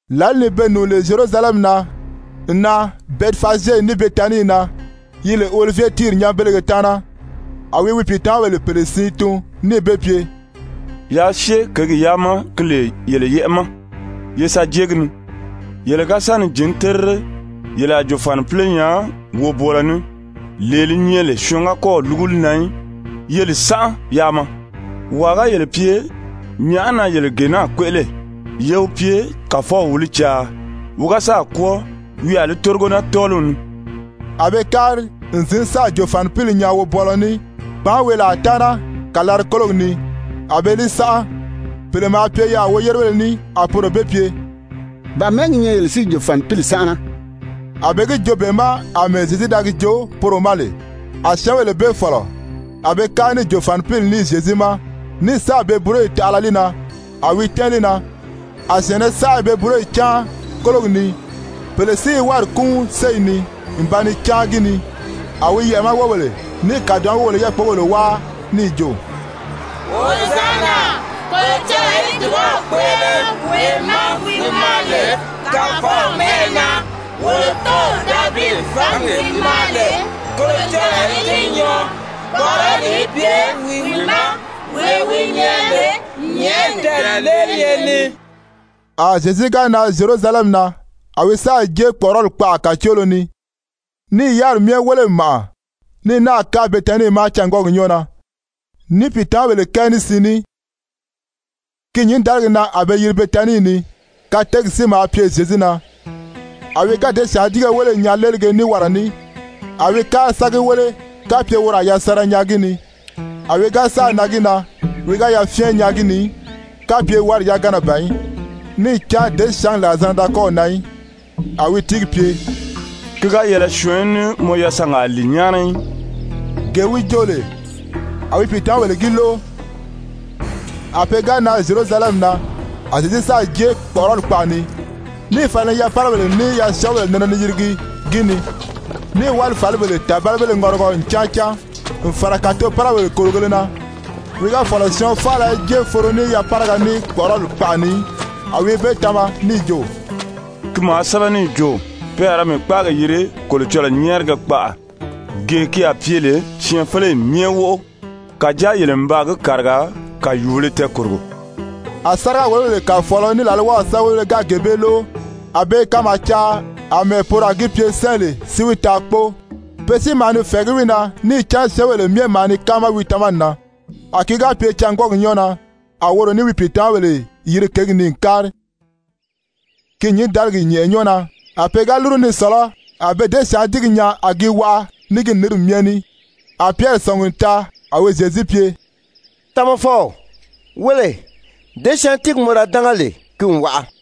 Lǎli ni be nùuni lè Zyerusalɛmi na n nan Bɛtifazye ní Betanii na yi lè Olivye tíiri nyanbelege taana, a wi wi pìitamabèle pèle siin tun, níì be pye: «Yaa syée kěgi yaa ma ki lè yele yɛ́ʔɛ ma ye sa jée gi ni. Yele ga sa ni jǐn terire, yele a jòfanipile nyaa wobwɔɔlɔ ní, lee li nyɛ lè syɔɔn ga kɔ́ɔ̀ lúgu li na í, ye li sánʔa yaa maa. Wàa ga yele pye: ‹Nyàʔá na yele gee naa kpéʔele?› Ye wi pye: ‹Kàfɔw wi li caa. Wi ga sáà kwɔ́ɔ, wi a li tórigo naa tɔ́ɔliw ni.›» A be kári n zǐn sáà jòfanipili nyaa wobwɔɔlɔ ní kpàánweelaa taana kàlari-kólogi ni, a be li sánʔa. Pèle maa pye yaà woyérebéle ní, a poro be pye: «Ba mɛ̀ɛ́ gi nyɛ yele si i jòfanipili sánʔana?» A be gi joo be ma àmɛɛ Zyezu da gi joo poro ma lè. A syɛ́ɛnbèle bee fɔ̀lɔ. A be kári ní jòfanipili ní Zyezu ma ní sáà be búroyi taʔala li na, á wi tɛ́ɛn li na. A syɛ̀ɛnnɛ saʔa i be búroyi cáan kólogi ni, pèle si i wári kúunri séyi ni n ba ni cáan gi ni. A wi yɛʔɛ̀ ma wóbèle ní kàdoʔo ma wóbèle i yákpogèle wáa níì jo: «Hozanna Kolocɔlɔɔ í dùbaw kpéʔele wee ma wi maa lè Kàfɔw mɛ́ʔɛ na. Wolo tóow Davidi fǎngi gi maa lè, Kolocɔlɔɔ í gi nyɔɔ. Kpɔ̀ʔɔrɔli í pye wi ma, wee wi nyɛ lè nyɛ̀ʔɛni tɛɛ̀leeliye ni!» A Zyezu ga nan Zyerusalɛmi na, a wi sáà jée kpɔ̀ʔɔrɔli kpaʔa kàcoolo ni, níì yáriri myɛ wéle n màʔa, ní náà kári Betanii ma cângwɔɔgi nyɔɔ na ní pìitamabèle kɛɛ ní siin ní. Ki nyǐndaligi na a be yiri Betanii ni, kateegi si maa pye Zyezu na. A wi ga děsyaantiige wéle n nyaa léelige ní wara ní, a wi kári sa gi wéle kapye woro a yasanra nyaa gi ni. A wi ga sáà nan gi na, wi ga yafyɛn nyaa gi ni í kapye wári yagana ban í, níì cán děsyaangi làrizanna da kɔ́ɔ̀ nan í. A wi tíigi pye: «Ki ga yɛlɛ syɔɔn í ní mɔ yasanga lìi nyáana í!» Gee wi joo lè, a wi pìitamabèle gi lóʔo. A pe ga nan Zyerusalɛmi na, a Zyezu sáà jée kpɔ̀ʔɔrɔli kpaʔa ni, níì fala ni yapárabèle ní yasyɔɔbèle nɛnɛ ni yirigi gi ni, níì wálifalibèle tàbalibéle ŋɔrigɔ n cáan cáan n fàra kàtopárabèle kòrigēle na. Wi ga fɔ̀lɔ syɔɔn faala í jée foro ní yapáraga ní kpɔ̀ʔɔrɔli kpaʔa ni í. A wi be tama níì jo: «Ki maa sɛ́bɛ níì jo: ‹Pe a ra mii kpáagi yiri Kolocɔlɔɔ nyɛ́ɛrigɛ kpaʔa, gee ki a pye lè syɛɛnfeleyi myɛ wóʔo.› Kàjáa yele n baa gi kàriga kàyuubēle tɛɛkòrogo.» A sáriga-wòlobèle kàfɔɔlɔ ní làlwaw sɛ́bɛwelebéle ga gee bee lóʔo, a be i kanmaa caa àmɛɛ poro a gi pye sɛ́ɛ lè si wi taa kpóo. Pe si maa ni fɛ̀ɛgí wi na níì cán syɛ́ɛnbèle myɛ maa ni káama wi tamani na. A ki ga pye cângwɔɔgi nyɔ́ɔ na, a woro ní wi pìitamabèle yiri kěgi ni n kári. Ki nyǐndaligi nyɛ̀ʔɛ nyɔ́ɔ na a pe ga lúru ni sɔ̀lɔ́, a be děsyaantiigi nyaa a gi waʔa ní gi nǐnri myɛ ní. A Pyɛri sɔ̀ngi n taa, a wi Zyezu pye: «Tamafɔw, wéle, děsyaantiigi mɔ da dánga lè, ki n waʔa.»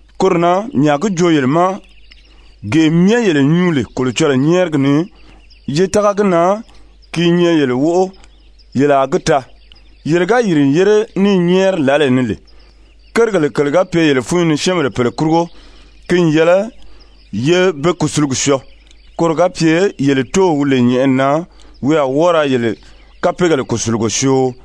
Koro na mii a gi joo yele ma, gee myɛ yele nyuu lè Kolocɔlɔɔ nyɛ́ɛrigi ni, ye tága gi na ki i nyɛ yele wóʔo yele a gi taa. Yele ga yìri n yére ní i nyɛ́ɛri lǎlee ni lè, kérigèle kèle ga pye yele fúnyi ni syɛ́ɛnbèle pèle kurugo, ki n yɛlɛ ye be kùsulugi syɔɔ. Koro ga pye yele Tóow wi lè nyɛ̀ʔɛni na, wi a wɔ́ɔ ra yele kapeegèle kùsulugo syoo. [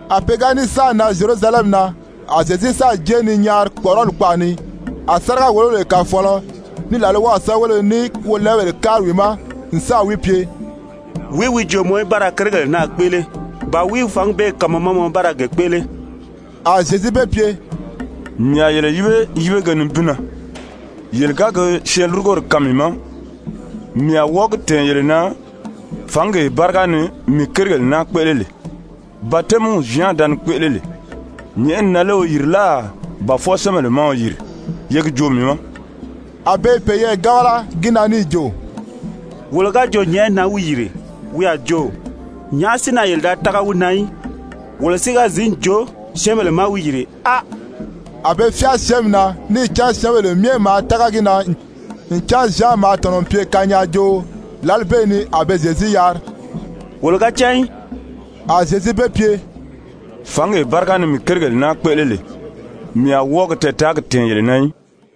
A pe ga ní sáà nan Zyerusalɛmi na, a Zyezu sáà jée ni nyaari kpɔ̀ʔɔrɔli kpaʔa ni. A sáriga-wòlobèle kàfɔɔlɔ, ní làlwaw sɛ́bɛwelebéle, ní wolɛɛbèle kári wi ma n sáà wi pye: «Wìí wi jo mɔ í ba ra kérigèle naa kpéʔele? Ba wìí wi fǎngi bee kaan mɔ ma mɔ í ba ra ge kpéʔele?» A Zyezu be pye: «Mii a yele yíbe yíbege nibin na, yele ga gi syɛɛnlurugori kaan mii ma, mii a wɔ́ɔ gi tɛ̀ɛn yele na fǎngee báriga ni mii kérigèle naa kpéʔele lè. Batɛmiw Zyan da ni kpéʔele lè, nyɛ̀ʔɛni na lé wi yìri láà ba fwɔɔ syɛ́ɛnbèle ma wi yìri? Ye gi joo mii ma.» A be i peyɛɛ gábala gi na níì jo: «Wolo ga jo nyɛ̀ʔɛni na wi yìri, wi a jo: Nyàʔá si na yele da tága wi na í? Wolo si ga zǐn jo syɛ́ɛnbèle má wi yìri, áa…» A be fyáa syɛ́ɛnmi na, níì cán syɛ́ɛnbèle myɛ maa tága gi na ncan Zyan maa tɔ̀nɔ n pye kanyaajooo. Lǎli bee ni a be Zyezu yari: «Wolo ga cán í.» A Zyezu be pye: «Fǎngee báriga ni mii kérigèle naa kpéʔele lè, mii a wɔ́ɔ gi tɛɛtaagi tɛ̀ɛn yele na í.»